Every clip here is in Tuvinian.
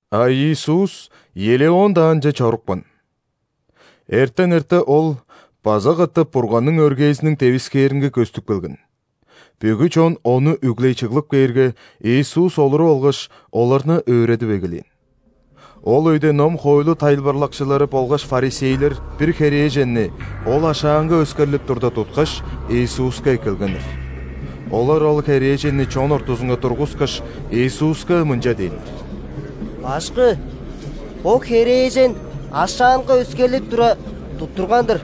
А Иисус Елеон даанче чорупкан. Эртен эрте Ол база катап Бурганның өргээзиниң девискээринге көстүп келген. Бүгү чон Ону үглей чыглып кээрге, Иисус, олуруп алгаш, оларны өөредип эгелээн. Ол өйде ном-хоойлу тайылбырлакчылары болгаш ·фарисейлер бир херээженни, ол ашаанга өскерлип турда, туткаш, Иисуска эккелгеннер. Олар ол херээженни чон ортузунга тургускаш, Иисуска мынча дээннер: «Башкы! Бо херээжен ашаанга өскерлип тура, туттурган-дыр.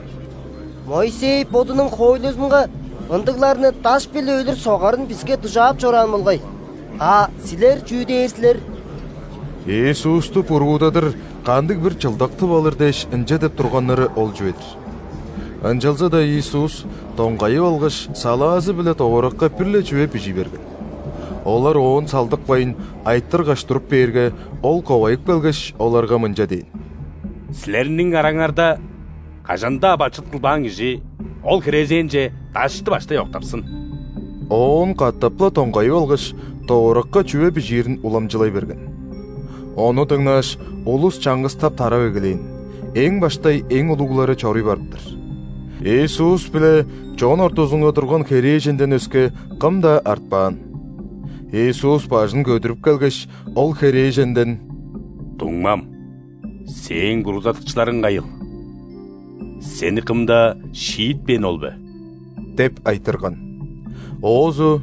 Моисей бодунуң хоойлузунга ындыгларны даш-биле өлүр согарын биске дужаап чораан болгай. А Силер чүү дээр силер?» Иисусту буруудадыр кандыг-бир чылдак тып алыр дээш ынча деп турганнары ол чүве-дир. Ынчалза-даа Иисус, доңгайып алгаш, салаазы-биле довуракка бир-ле чүве бижий берген. Олар Оон салдыкпайн, айтыргаш туруп бээрге, Ол ковайып келгеш, оларга мынча дээн: «Силерниң араңарда кажан-даа бачыт кылбаан кижи ол херээженче дашты баштай октапсын!» Оон катап-ла доңгайып алгаш, довуракка чүве бижиирин уламчылай берген. Ону дыңнааш, улус чаңгыстап тарап эгелээн, эң баштай эң улуглары чоруй барып-тыр. Иисус биле чон ортузунга турган херээженден өске, кым-даа артпаан. Иисус бажын көдүрүп келгеш, ол херээженден: «Дуңмам! Сээң буруудадыкчыларың кайыл? Сени кым-даа шиитпээни ол бе?» – деп айтырган. Оозу: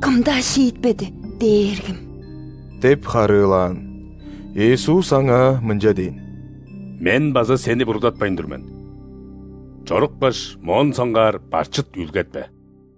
«Кым-даа шиитпеди, Дээргим» – деп харыылаан. Иисус аңаа мынча дээн: «Мен база сени буруудатпайн тур мен. Чорупкаш, моон соңгаар бачыт үүлгетпе».]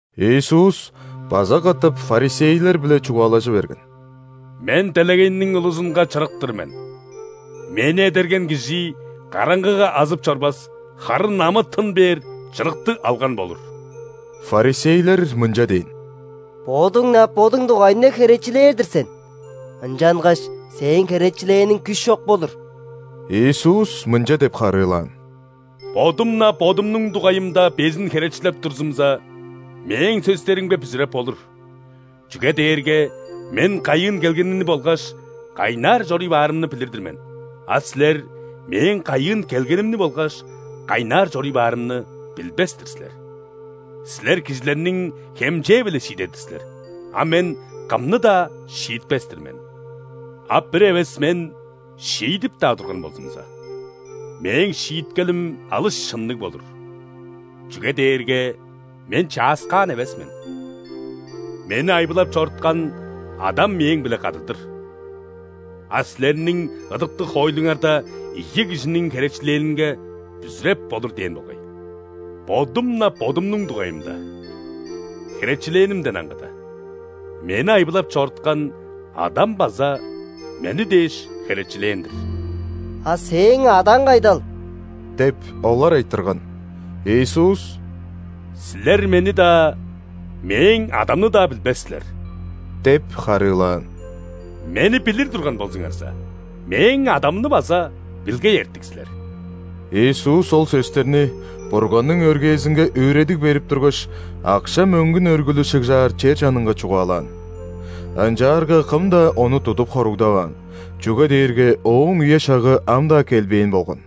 Иисус база катап ·фарисейлер-биле чугаалажы берген: «Мен – бо делегейниң улузунга Чырык-тыр мен. Мени эдерген кижи караңгыга азып чорбас, харын амы-тын бээр чырыкты алган болур». Фарисейлер мынча дээн: «Бодуң-на Бодуң дугайыңда херечилээр-дир сен. Ынчангаш Сээң херечилээниң күш чок болур». Иисус мынча деп харыылаан: «Бодум-на Бодумнуң дугайымда безин херечилеп турзумза, Мээң сөстеримге бүзүреп болур. Чүге дээрге Мен кайыын келгенимни болгаш кайнаар чоруй баарымны билир-дир мен, а силер Мээң кайыын келгенимни болгаш кайнаар чоруй баарымны билбес-тир силер. Силер кижилерниң хемчээ-биле шиидер-дир силер, а Мен кымны-даа шиитпес-тир мен. А бир эвес Мен шиидип-даа турган болзумза, Мээң шииткелим алыс шынныг болур, чүге дээрге Мен чааскаан эвес мен: Мени айбылап чоруткан Адам Мээң-биле кады-дыр. А силерниң ыдыктыг хоойлуңарда ийи кижиниң херечилээнинге бүзүреп болур дээн болгай. Бодум-на Бодумнуң дугайымда херечилээнимден аңгыда, Мени айбылап чоруткан Адам база Мени дээш херечилээн-дир». «А Сээң Адаң кайдал?» – деп, олар айтырган. Иисус: «Силер Мени-даа, Мээң Адамны-даа билбес силер – деп харыылаан. – Мени билир турган болзуңарза, Мээң Адамны база билгей эртик силер». Иисус ол сөстерни Бурганның өргээзинге өөредиг берип тургаш, акша-мөңгүн өргүлү шыгжаар чер чанынга чугаалаан. Ынчаарга кым-даа Ону тудуп хоругдаваан, чүге дээрге Ооң үе-шагы ам-даа келбээн болган.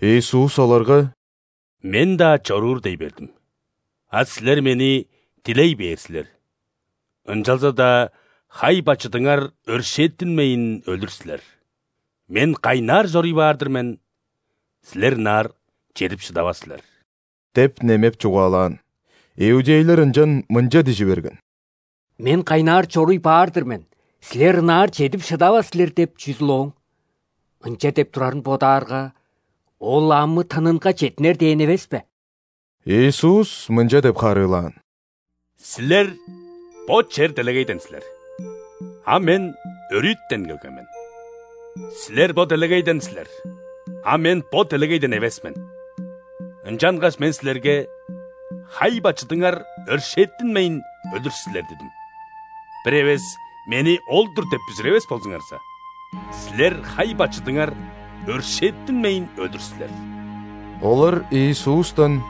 Иисус оларга: «Мен-даа чоруур дей бердим. А силер Мени дилей бээр силер, ынчалза-даа хай-бачыдыңар өршээттинмейн өлүр силер. Мен кайнаар чоруй баар-дыр мен, силер ынаар чедип шыдавас силер» – деп немеп чугаалаан. Иудейлер ынчан мынча дижи берген: «„Мен кайнаар чоруй баар-дыр мен, силер ынаар чедип шыдавас силер“ – деп чүзүл ооң, ынча деп турарын бодаарга, Ол амы-тынынга четтинер дээн эвес бе?» Иисус мынча деп харыылаан: «Силер бо чер-делегейден силер, а Мен – өрүтен келген мен. Силер бо делегейден силер, а Мен бо делегейден эвес мен. Ынчангаш Мен силерге: „Хай-бачыдыңар өршээттинмейн өлүр силер“ – дидим. Бир эвес Мени Ол-дур деп бүзүревес болзуңарза, силер хай-бачыдыңар өршээттинмейн өлүр силер». Олар Иисустан: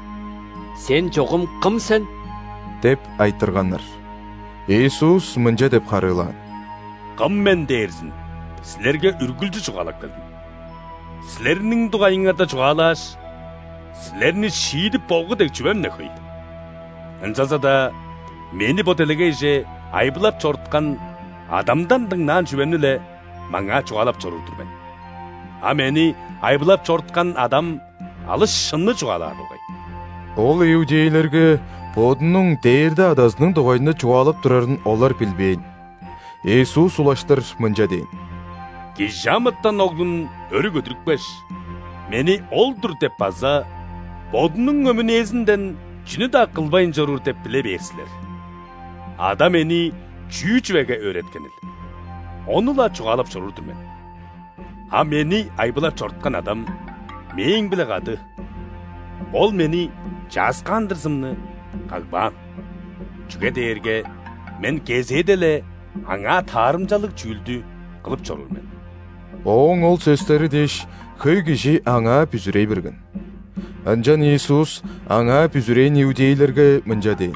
«Сен чогум кым сен?» – деп айтырганнар. Иисус мынча деп харыылаан: «Кым Мен дээрзин силерге үргүлчү чугаалап келдим. Силерниң дугайыңарда чугаалааш, силерни шиидип болгу дег чүвем-не хөй. Ынчалза-даа Мени бо делегейже айбылап чоруткан Адамдан дыңнаан чүвемни-ле маңаа чугаалап чоруур-дур мен, а Мени айбылап чоруткан Адам алыс шынны чугаалаар болгай». Ол иудейлерге Бодунуң дээрде Адазының дугайында чугаалап турарын олар билбээн. Иисус улаштыр мынча дээн: «·Кижи амытан Оглун өрү көдүрүпкеш, Мени Ол-дур деп база Бодунуң өмүнээзинден чүнү-даа кылбайн чоруур деп биле бээр силер: Ада Мени чүү чүвеге өөреткенил, ону-ла чугаалап чоруур-дур мен. А Мени айбылап чоруткан Адам Мээң-биле кады – Ол мени чааскаандырзымны кагбаан, чүге дээрге Мен кезээде-ле Аңаа таарымчалыг чүүлдү кылып чоруур мен». Ооң ол сөстери дээш, хөй кижи Аңаа бүзүрей берген. Ынчан Иисус Аңаа бүзүрээн иудейлерге мынча дээн: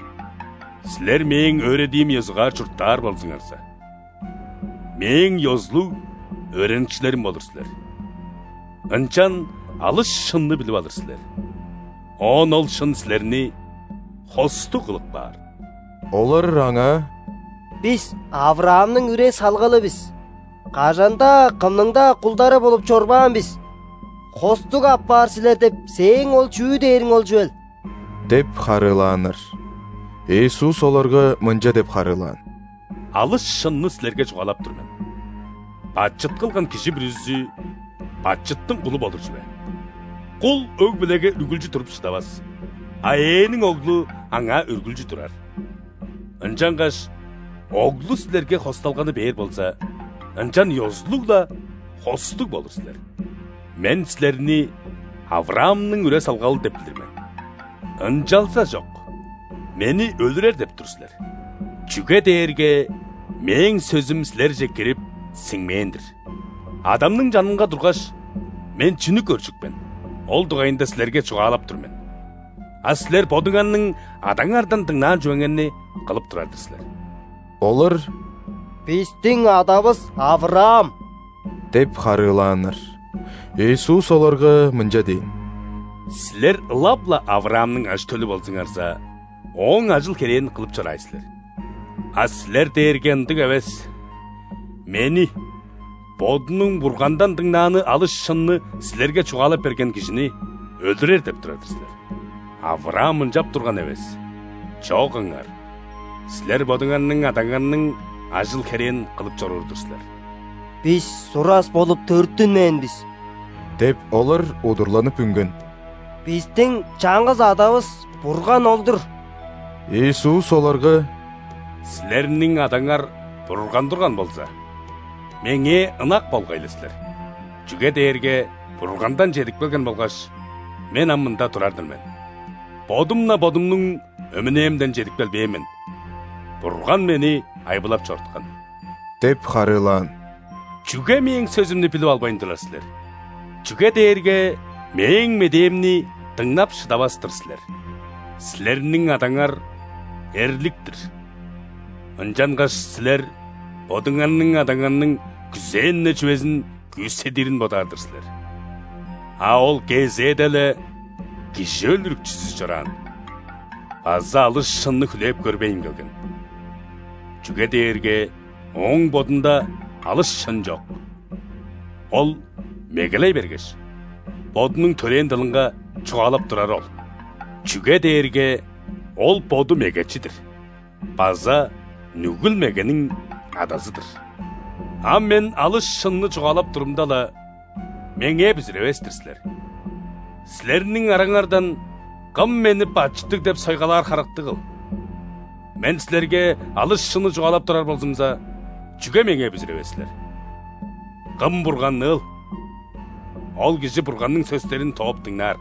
«Силер Мээң өөредиим ёзугаар чурттаар болзуңарза, Мээң ёзулуг өөреникчилерим болур силер. Ынчан алыс шынны билип алыр силер – оон ол шын силерни хостуг кылып каар». Олар Аңаа: «Бис – ·Авраамның үре-салгалы бис, кажан-даа, кымның-даа кулдары болуп чорбаан бис! „Хостуг апаар силер“ деп сээң ол чүү дээриң ол чүвел?» – деп харыылааннар. Иисус оларга мынча деп харыылаан: «Алыс шынны силерге чугаалап тур мен: бачыт кылган кижи бүрүзү бачыттың кулу болур чүве. Кул өг-бүлеге үргүлчү туруп шыдавас, а ээниң оглу аңаа үргүлчү турар. Ынчангаш Оглу силерге хосталганы бээр болза, ынчан ёзулуг-ла хостуг болур силер. Мен силерни Авраамның үре-салгалы деп билир мен. Ынчалзажок Мени өлүрер деп тур силер – чүге дээрге Мээң сөзүм силерже кирип, сиңмээн-дир. Адамның чанынга тургаш, Мен чүнү көржүк мен, ол дугайында силерге чугаалап тур мен, а силер бодуңарның адаңардан дыңнаан чүвеңерни кылып турар-дыр силер». Олар: «Бистиң адавыс – Авраам!» – деп харыылааннар. Иисус оларга мынча дээн: «Силер ылап-ла Авраамның ажы-төлү болзуңарза, ооң ажыл-херээн кылып чораай силер. А силер дээрге ындыг эвес, Мени – Бодунуң Бургандан дыңнааны алыс шынны силерге чугаалап берген кижини – өлүрер деп турар-дыр силер! Авраам ынчап турган эвес. Чок ыңар, силер бодуңарның адаңарның ажыл-херээн кылып чоруур-дур силер». «Бис сурас болуп төрүттүнмээн бис – деп, олар удурланып үнген. – Бистиң чаңгыс Адавыс – Бурган ол-дур». Иисус оларга: «Силерниң Адаңар Бурган турган болза, Меңээ ынак болгай-ла силер, чүге дээрге Бургандан чедип келген болгаш, Мен ам мында турар-дыр мен. Бодум-на Бодумнуң өмүнээмден чедип келбээн мен – Бурган Мени айбылап чоруткан! – деп харыылаан. – Чүге Мээң сөзүмнү билип албайн турар силер? Чүге дээрге Мээң медээмни дыңнап шыдавас-тыр силер. Силерниң адаңар – эрлик-тир, ынчангаш силер бодуңарның адаңарның күзээн-не чүвезин күүседирин бодаар-дыр силер. А ол кезээде-ле кижи өлүрүкчүзү чораан база алыс шынны хүлээп көрбейн келген, чүге дээрге ооң бодунда алыс шын чок. Ол мегелей бергеш, бодунуң төрээн дылынга чугаалап турары ол, чүге дээрге ол боду мегечи-дир база нүгүл-мегениң адазы-дыр. А Мен алыс шынны чугаалап турумда-ла, Меңээ бүзүревес-тир силер! Силерниң араңардан кым Мени бачыттыг деп сойгалаар харыктыгыл? Мен силерге алыс шынны чугаалап турар болзумза, чүге меңээ бүзүревес силер? Кым Бурганныыл, ол кижи Бурганның сөстерин тооп дыңнаар.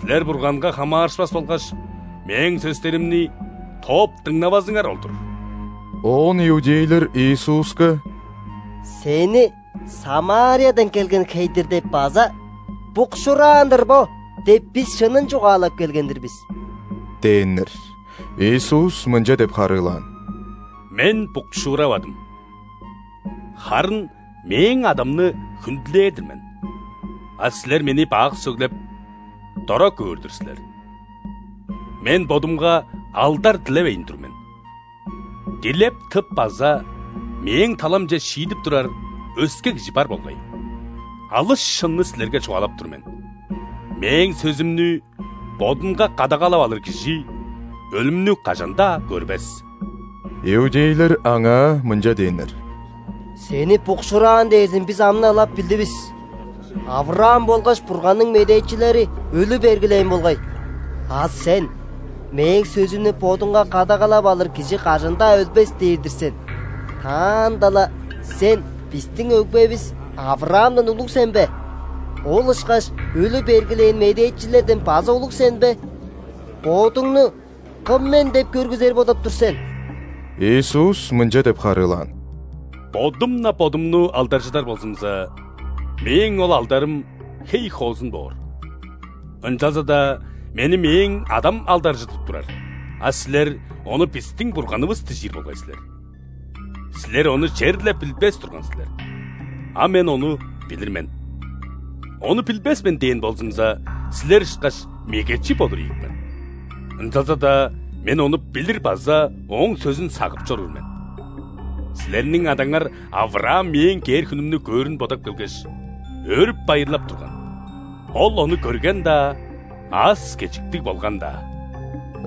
Силер Бурганга хамаарышпас болгаш, Мээң сөстеримни тооп дыңнавазыңар ол-дур». Оон иудейлер Иисуска: «Сени „·Самариядан келген хей-дир“ деп база „Букшуураан-дыр бо“ деп, бис шынын чугаалап келген-дир бис» – дээннер. Иисус мынча деп харыылаан: «Мен букшууравадым, харын Мээң Адамны хүндүлээр-дир мен, а силер Мени бак сөглеп, дора көөр-дүр силер. Мен Бодумга алдар дилевейн тур мен. Дилеп тып база Мээң таламче шиидип турар өске Кижи бар болгай. Алыс шынны силерге чугаалап тур мен: Мээң сөзүмнү бодунга кадагалап алыр кижи өлүмнү кажан-даа көрбес». Иудейлер Аңаа мынча дээннер: «Сени букшуураан дээрзин бис ам-на ылап билдивис. ·Авраам болгаш Бурганның медээчилери өлү бергилээн болгай. А Сен: „Мээң сөзүмнү бодунга кадагалап алыр кижи кажан-даа өлбес“ – дээр-дир сен. Таанда-ла Сен бистиң өгбевис Авраамдан улуг сен бе? Ол ышкаш өлү бергилээн медээчилерден база улуг сен бе? Бодуңну Кым мен деп көргүзер бодап тур сен?» Иисус мынча деп харыылаан: «Бодум-на Бодумну алдаржыдар болзумза, Мээң ол алдарым хей хоозун боор. Ынчалза-даа Мени Мээң Адам алдаржыдып турар – а силер Ону бистиң Бурганывыс дижир болгай силер! Силер Ону черле билбес турган силер, а Мен Ону билир мен. „Ону билбес мен“ дээн болзумза, силер ышкаш мегечи болур ийик мен. Ынчалза-даа Мен Ону билир база Ооң сөзүн сагып чоруур мен. Силерниң адаңар ·Авраам Мээң кээр хүнүмнү көөрүн бодап келгеш, өөрүп-байырлап турган. Ол ону көрген-даа, аас-кежиктиг болган-даа!»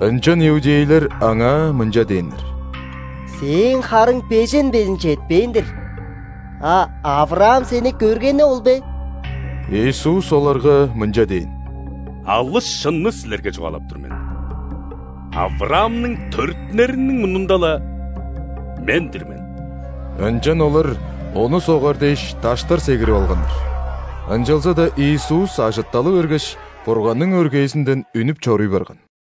Ынчан иудейлер Аңаа мынча дээннер: «Сээң харың бежен безин четпээн-дир, а Авраам Сени көргени ол бе?» Иисус оларга мынча дээн: «Алыс шынны силерге чугаалап тур мен: Авраамның төрүттүнериниң мурнунда-ла, МЕН-ДИР МЕН». Ынчан олар Ону согар дээш, даштар сегирип алганнар. Ынчалза-даа Иисус ажытталы бергеш, Бурганның өргээзинден үнүп чоруй барган.